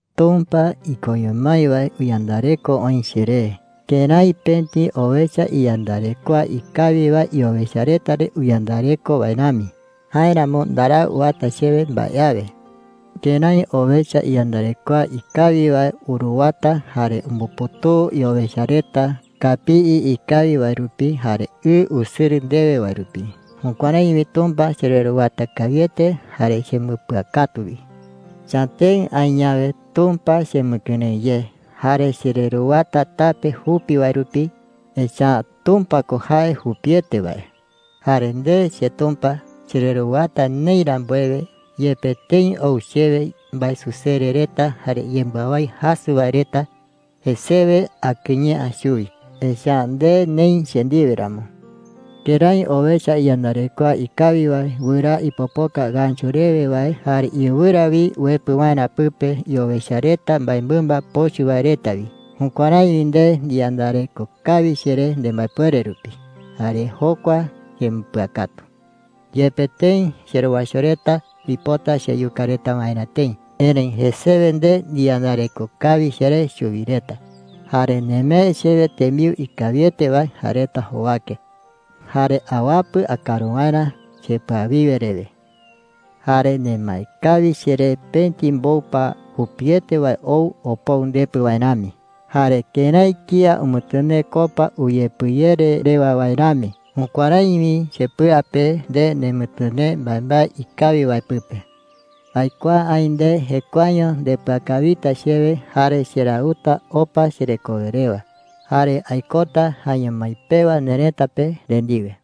Tumpa ikoño mái wae uyandareko oï cheré kërái pëti owecha iyandarekoa ikawi wae iowecha reta re uyandareko wae rami. Jáeramo ndarau uata chewe mbae awe. Kërái owecha iyandarekoa ikawi wae uruwata jare umbuputuu iowecha reta kapii ikawi wae rupi jare ɨ usɨrɨ ndewe wae rupi, jukuärái wi Tumpa chereruwata kawiete jare chembɨpɨakatu wi. Chatëɨ aï yawe, Tumpa chemɨkɨrëɨ ye. Jare chereruwata tape jupi wae rupi, echa’ä Tumpa ko jae jupiete wae. Jare nde, cheTumpa, chereruwata neï rambuewe, yepe tëi ou chewe mbaesusere reta jare yembɨawái jasɨ wae reta, jesewe akɨye’ä chuwi, echa’ä nde neï che ndiwe ramo. Kërái owecha iyandarekoa ikawi wae wɨraa ipopoka ngächu Amokue wae reta jei chupe “tɨ̈ai.” rewe wae jare iɨwɨra wi uepɨ waerä pɨpe iowecha reta mbaemɨmba pochɨ wae reta wi, jukuärái wi nde ndiyandareko kawi cheré nembaepuere rupi. Jare jokua chembɨpɨakatu. Yepe tëi cherowaicho reta uipota cheyuka reta waerä tëi, erëi jesewe nde ndiyandareko kawi cheré chuwi reta. Jare nemee chewe tembiu ikawiete wae jae reta jowake, jare awapɨ akaru waerä chepɨawiwe rewe. Jare nemae kawi cheré pëti mboupa jupiete wae ou opou ndepɨ wae rami. Jare kërái kía umɨtɨnee copa uyepɨyere rewa wae rami, jukuärái wi chepɨa pe nde nemɨtɨnee mbaembae ikawi wae pɨpe. Aikuaa aï nde jekuaeño ndepɨakawita chewe jare cherauta opa cherekowe rewa. Jare aikota jaeño mái pewa nerëta pe nde ndiwe.